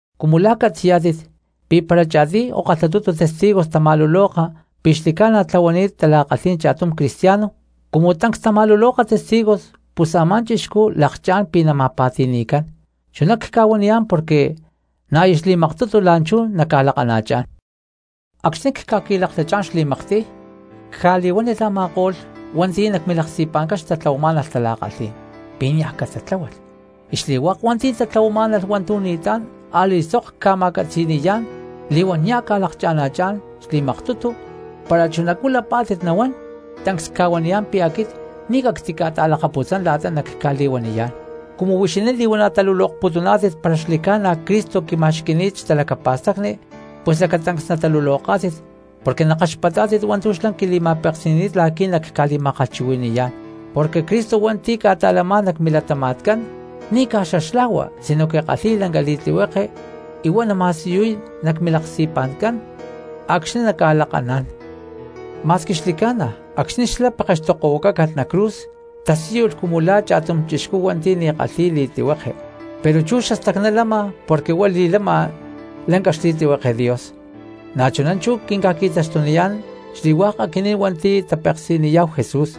Cumu la̠ catzi̠yá̠tit pi̠ para cha̠tiy o kalhatutu testigos tama̠luloka pi̠ xli̠ca̠na tlahuani̠t tala̠kalhí̠n cha̠tum cristiano, cumu tancs tama̠luloka testigos pus a̠má chixcú lakchá̠n pi̠ nama̠pa̠ti̠ni̠cán. Chuná cca̠huaniyá̠n porque na̠ aya xli̠maktutu la̠nchú nacca̠lakana̠chá̠n. Acxni̠ cca̠qui̠laklachá̠n xli̠maktiy cca̠li̠huánilh a̠ma̠ko̠lh hua̠nti̠ nac milaksti̠pa̠ncán xtatlahuamá̠nalh tala̠kalhí̠n pi̠ niaj catatláhualh, y xli̠hua̠k hua̠nti̠ tatlahuamá̠nalh hua̠ntu̠ ni̠tlá̠n a̠li̠sok cca̠ma̠catzi̠ni̠yá̠n li̠huán nia̠ cca̠lakana̠chá̠n xli̠maktutu, para chunacú lapá̠tit nahuán, tancs cca̠huaniyá̠n pi̠ aquit ni̠ cactica̠ta̠lakatputzán la̠ta nacca̠li̠huaniyá̠n. Cumu huixinín li̠huana̠ talulokputuná̠tit para xli̠ca̠na Cristo quima̠xqui̠ni̠t xtalacapa̠stacni, pus lacatancs nataluloká̠tit porque nakaxpatá̠tit hua̠ntu̠ xlá quili̠ma̠peksi̠ni̠t la̠qui̠ nacca̠li̠ma̠kalhchuhui̠ni̠yá̠n, porque Cristo hua̠nti̠ ca̠ta̠lamá̠n nac milatama̠tcán ni̠ caj xaxlajua sinoque kalhi̠y lanca xli̠tlihueke y huá nama̠siyuy nac milaksti̠pa̠ncán acxni̠ nacca̠lakaná̠n. Ma̠squi xli̠ca̠na acxni̠ xlá pekextokohuacácalh nac cruz tasíyulh cumu la̠ cha̠tum hua̠nti̠ ni̠ kalhi̠y li̠tlihueke, pero chú xastacná lama porque huá li̠lama lanca xli̠tlihueke Dios. Na̠chuná chú quinca̠qui̠taxtuniyá̠n xli̠hua̠k aquinín hua̠nti̠ tapeksi̠niyá̠hu Jesús,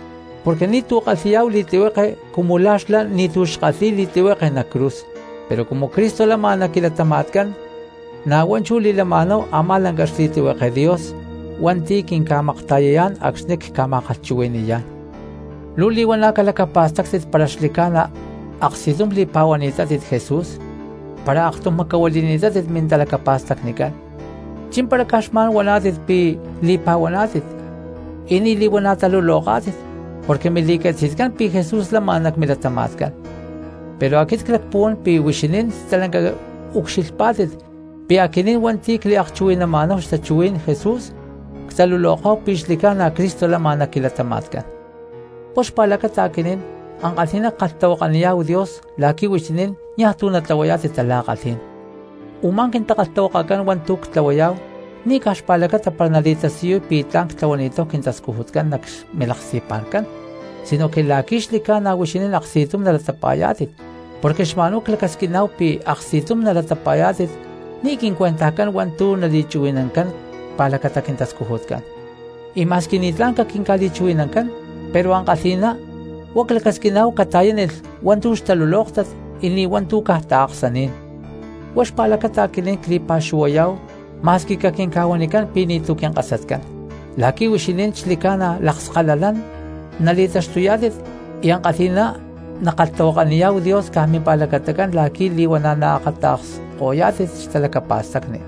porque ni̠tu̠ kalhi̠yá̠hu li̠tlihueke cumu la̠ xlá ni̠tu̠ xkalhi̠y li̠tlihueke nac cruz, pero cumu Cristo lama nac quilatama̠tcán na̠ huá chú li̠lama̠náhu a̠má lanca xli̠tlihueke Dios hua̠nti̠ quinca̠makta̠yayá̠n acxni̠ cca̠ma̠kalhchuhui̠ni̠yá̠n. Luu li̠huana̠ calacapa̠stáctit para xli̠ca̠na aksti̠tum li̠pa̠huaná̠tit Jesús, para aktum macahuili̠ni̠tátit mintalacapa̠stacnicán. ¿Chí̠mpara caj xma̠n huaná̠tit pi̠ li̠pa̠huaná̠tit y ni̠ li̠huana̠ taluloká̠tit? ¡Porque mili̠catzi̠tcán pi̠ Jesús lama nac milatama̠tcán! Pero aquit clacpuhuán pi̠ huixinín stalanca ucxilhpá̠tit pi̠ aquinín hua̠nti̠ cliakchuhui̠nama̠náhu xtachuhuí̠n Jesús ctaluloká̠hu pi̠ xli̠ca̠na Cristo lama nac quilatama̠tcán. Huá xpa̠lacata aquinín ankalhi̠ná ckalhtahuakaniyá̠hu Dios la̠qui̠ huixinín niaj tu̠ natlahuayá̠tit tala̠kalhí̠n; u̠má quintakalhtahuakacán hua̠ntu̠ ctlahuayá̠hu ni̠ caj xpa̠lacata para nali̠tasiyuy pi̠ tla̠n ctlahuani̠táhu quintascujutcán nac milaksti̠pa̠ncán, sinoque la̠qui̠ xli̠ca̠na huixinín aksti̠tum nalatapa̠yá̠tit. Porque xma̠nhuá clacasquiná̠hu pi̠ aksti̠tum nalatapa̠yá̠tit ni̠ quincuentajcán hua̠ntu̠ nali̠chuhui̠nancán xpa̠lacata quintascujutcán. Y ma̠squi ni̠tlá̠n caquinca̠li̠chuhui̠nancán pero ankalhi̠ná huá clacasquiná̠hu cata̠yánilh hua̠ntu̠ xtalulóktat y ni̠ hua̠ntu̠ caj taaksaní̠n. Huá xpa̠lacata aquinín cli̠pa̠xuhuayá̠hu ma̠squi caquinca̠huanicán pi̠ ni̠tu̠ quinkasatcán, la̠qui̠ huixinín xli̠ca̠na lakskalalán nali̠taxtuyá̠tit y ankalhi̠ná nackalhtahuakaniyá̠hu Dios caj mimpa̠lacatacán la̠qui̠ li̠huana̠ naakata̠ksko̠yá̠tit xtalacapa̠stacni.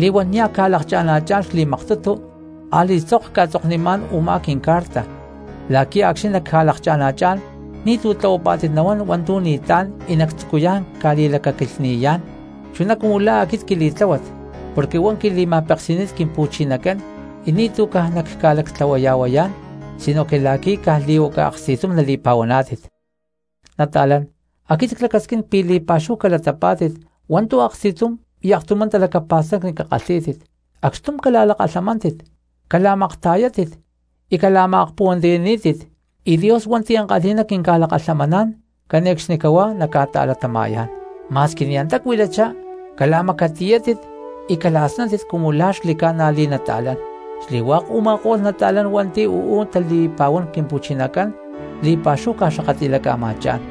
Li̠huán nia̠ cca̠lakana̠chá̠n xli̠maktutu a̠li̠sok cca̠tzoknimá̠n u̠má quincarta la̠qui̠ acxni̠ nacca̠lakana̠chá̠n ni̠tu̠ tlahuapá̠tit nahuán hua̠ntu̠ ni̠tlá̠n y nactzucuyá̠n ca̠li̠lacaquilhni̠yá̠n, chuná cumu la̠ aquit quili̠tláhuat porque huá quili̠ma̠peksi̠ni̠t Quimpu̠chinacán y ni̠tu̠ caj nacca̠lactlahuaya̠huayá̠n, sinoque la̠qui̠ caj li̠huaca aksti̠tum nali̠pa̠huaná̠tit. Nata̠lán, aquit clacasquín pi̠ li̠pa̠xúhu cala̠ta̠latapá̠tit hua̠ntu̠ aksti̠tum y aktumá talacapa̠stacni cakalhí̠tit, acxtum cala̠lakalhamántit cala̠makta̠yátit y cala̠ma̠akpuhuantiyaní̠tit; y Dios hua̠nti̠ ankalhi̠ná quinca̠lakalhamaná̠n cane̠cxnicahuá naca̠ta̠latama̠yá̠n. Ma̠squi ni̠ antá cuilachá, cala̠macatiyátit y cala̠snáttit cumu la̠ xli̠ca̠na li̠nata̠lán. Xli̠hua̠k u̠ma̠ko̠lh nata̠lán hua̠nti̠ uú tali̠pa̠huán Quimpu̠chinacán li̠pa̠xúhu ca̠xakatli̠laca̠ma̠chá̠n.